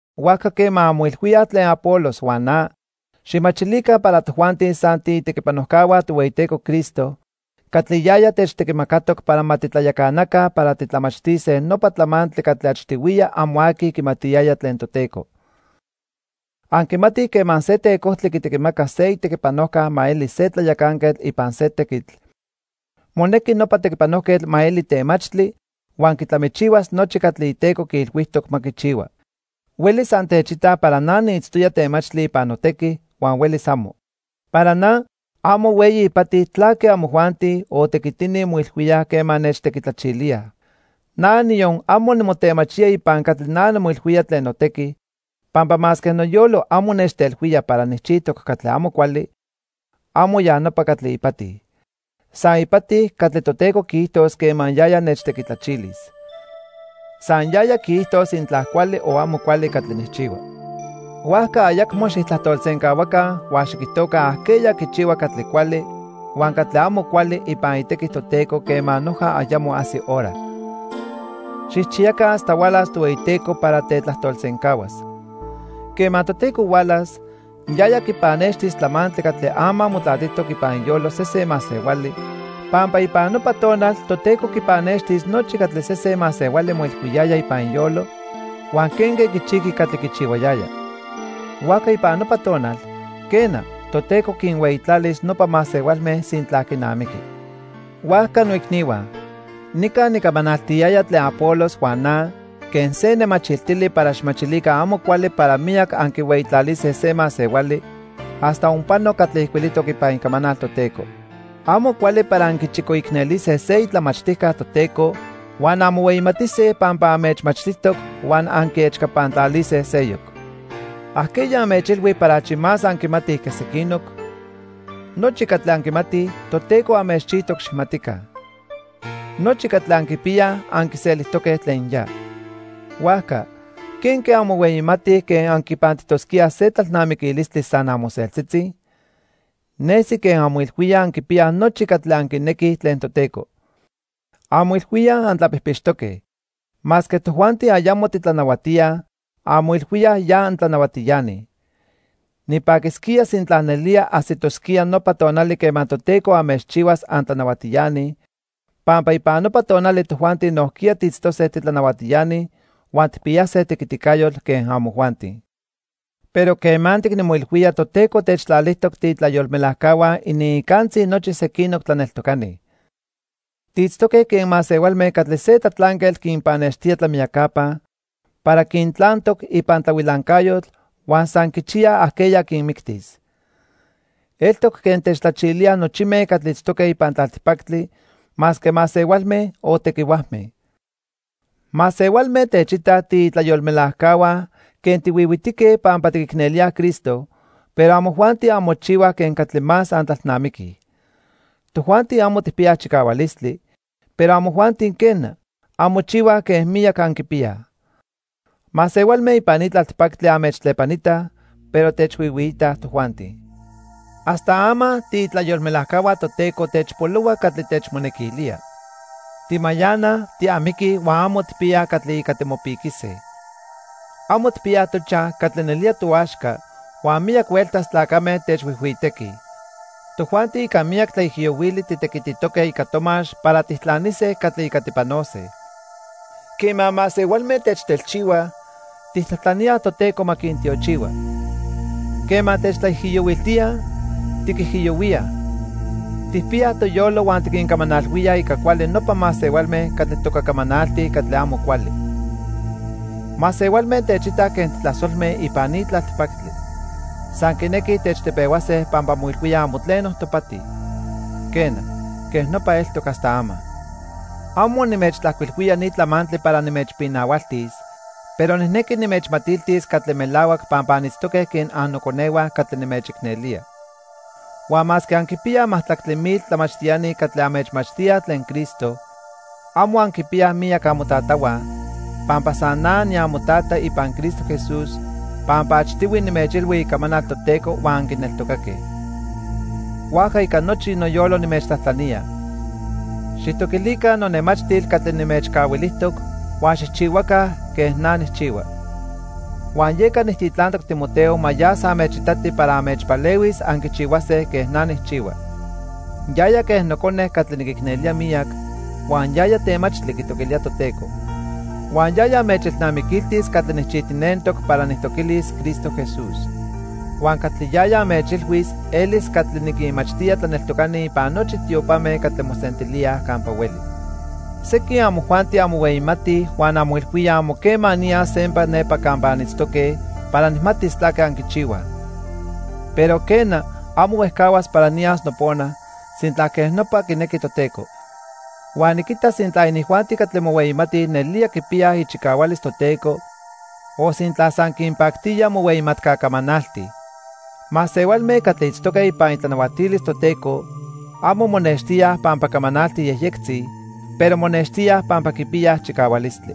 Huajca quema anmoilhuíaj tlen Apolos huan na, xijmachilica para tojuanti san tiitequipanojcahua Tohueyiteco Cristo catli yaya techtequimacatoc para ma titlayacanaca para titlamachtise nopa tlamantli catli achtihuiya amo aqui quimatiyaya tlen Toteco. Anquimatij quema se tecojtli quitequimaca se itequipanojca ma eli se tlayacanquetl ipan se tequitl, monequi nopa tequipanojquetl ma eli temachtli huan quitlamichihuas nochi catli iteco quiilhuijtoc ma quichihua. Huelis antechitaj para na niitztoya temachtli ipan notequi, huan huelis amo. Para na, amo hueyi ipati tlaque amojuanti o tequitini moilhuíaj quema nechtequitlachilíaj. Na, niyon amo nimotemachía ipan catli na nimoilhuía tlen notequi, pampa masque noyolo amo nechtelhuía para nijchijtoc catli amo cuali, amo ya nopa catli ipati. San ipati catli Toteco quiijtos quema yaya nechtequitlachilis. San yaya quiijtos sintla cuali o amo cuali catli nijchihua. Huajca ayacmo xijtlajtolsencahuaca huan xiquijtoca ajqueya quichihua catli cuali huan catli amo cuali ipan itequi Toteco quema noja ayamo ajsi hora. Xijchiyaca hasta hualas Tohueyiteco para tetlajtolsencahuas. Quema Toteco hualas, yaya quipannextis tlamantli catli ama motlatijtoc ipan iyolo sesen masehuali, pampa ipan nopa tonal Toteco quipannextis nochi catli sesen masehuali moilhuiyaya ipan iyolo huan quenque quichijqui catli quichihuayaya. Huajca ipan nopa tonal, quena, Toteco quinhueyitlalis nopa masehualme sintla quinamiqui. Huajca noicnihua, nica nicamanaltiyaya tlen Apolos huan na quen se nemachiltili para xijmachilica amo cuali para miyac anquihueyitlalise se masehuali hasta onpano catli ijcuilijtoc ipan Icamanal Toteco. Amo cuali para anquichicoicnelise se itlamachtijca Toteco huan anmohueyimatise pampa anmechmachtijtoc huan anquiechcapantlalise seyoc. ¿Ajqueya anmechilhui para achi más anquimatij que sequinoc? Nochi catli anquimatij, Toteco anmechchijtoc xijmatica. Nochi catli anquipiyaj anquiselijtoque tlen ya. Huajca, ¿quenque anmohueyimatij quen anquipantijtosquíaj se tlalnamiquilistli san amoseltzitzi? Nesi quen anmoilhuíaj anquipiyaj nochi catli anquinequij tlen Toteco. Anmoilhuíaj antlapijpixtoque. Masque tojuanti ayamo titlanahuatíaj, anmoilhuíaj ya antlanahuatiani. Nipaquisquía sintla nelía ajsitosquía nopa tonali quema Toteco anmechchihuas antlanahuatiani, pampa ipan nopa tonali tojuanti nojquiya tiitztose titlanahuatiani huan tijpiyase tequiticayotl quen amojuanti. Pero quemantic nimoilhuía Toteco techtlalijtoc tiitlayolmelajcahua iniicantzi nochi sequinoc tlaneltocani. Tiitztoque quen masehualme catli se tlatlanquetl quinpannextía tlamiyacapa para quintlantoc ipan tlahuilancayotl huan san quichiyaj ajqueya quinmictis. Eltoc quen techtlachilíaj nochime catli itztoque ipan tlaltipactli, masque masehualme o tequihuajme. Masehualme techitaj tiitlayolmelajcahua quen tihuihuitique pampa tiquicnelíaj Cristo, pero amojuanti anmochihuaj quen catli más antlalnamiquij. Tojuanti amo tijpiyaj chicahualistli, pero amojuanti quena, anmochihuaj quen miyac anquipiyaj. Masehualme ipan ni tlaltipactli anmechtlepanitaj, pero techhuihuiitaj tojuanti. Hasta ama tiitlayolmelajcahua Toteco techpolohua catli techmonequilía. Timayanaj, tiamiquij huan amo tijpiyaj catli ica timopiquise. Amo tijpiyaj tochaj catli nelía toaxca huan miyac hueltas tlacame techhuijhuitequij. Tojuanti ica miyac tlaijiyohuili titequititoque ica tomax para tijtlanise catli ica tipanose. Quema masehualme techtelchihuaj, tijtlajtlaníaj Toteco ma quintiochihua. Quema techtlaijiyohuiltíaj, tiquijiyohuíaj. Tijpiyaj toyolo huan tiquincamanalhuíaj ica cuali nopa masehualme catli toca camanaltij catli amo cuali. Masehualme techitaj quen titlasolme ipan ni tlaltipactli. San quinequij techtepehuase pampa moilhuíaj amo tleno topati. Quena, quej nopa eltoc hasta ama. Amo nimechtlajcuilhuía ni tlamantli para nimechpinahualtis, pero nijnequi nimechmatiltis catli melahuac pampa anitztoque quen annoconehua catli nimechicnelía. Huan masque anquipiyaj majtlactli mil tlamachtiani catli anmechmachtíaj tlen Cristo, amo anquipiyaj miyac amotatahua, pampa san na niamotata ipan Cristo Jesús pampa achtihui nimechilhui icamanal Toteco huan anquineltocaque. Huajca ica nochi noyolo nimechtlajtlanía, xijtoquilica nonemachtil catli nimechcahuilijtoc huan xijchihuaca quen na nijchihua. Huan yeca nijtitlantoc Timoteo ma yas anmechitati para anmechpalehuis anquichihuase quen na nijchihua. Yaya quen nocone catli niquicnelía miyac huan yaya temachtli quitoquilía Toteco. Huan yaya anmechelnamiquiltis catli nijchijtinentoc para nijtoquilis Cristo Jesús. Huan catli yaya anmechilhuis elis catli niquinmachtía tlaneltocani ipan nochi tiopame catli mosentilíaj campa hueli. Sequin amojuanti anmohueyimatij huan anmoilhuíaj amo quema niyas sempa nepa campa anitztoque para nijmatis tlaque anquichihuaj. Pero, quena, amo huejcahuas para niyas nopona, sintla quej nopa quinequi Toteco. Huan niquitas sintla inijuanti catli mohueyimatij nelía quipiyaj ichicahualis Toteco o sintla san quinpactía mohueyimatca camanaltij. Masehualme catli itztoque ipan itlanahuatilis Toteco amo monextíaj pampa camanaltij yejyectzi, pero monextíaj pampa quipiyaj chicahualistli.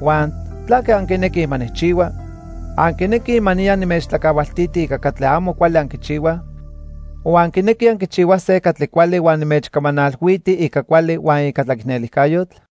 Huan ¿tlaque anquinequij ma nijchihua? ¿Anquinequij ma niya nimechtlacahualtiti ica catli amo cuali anquichihuaj? O ¿anquinequij anquichihuase catli cuali huan nimechcamanalhuiti ica cuali huan ica tlaicnelijcayotl?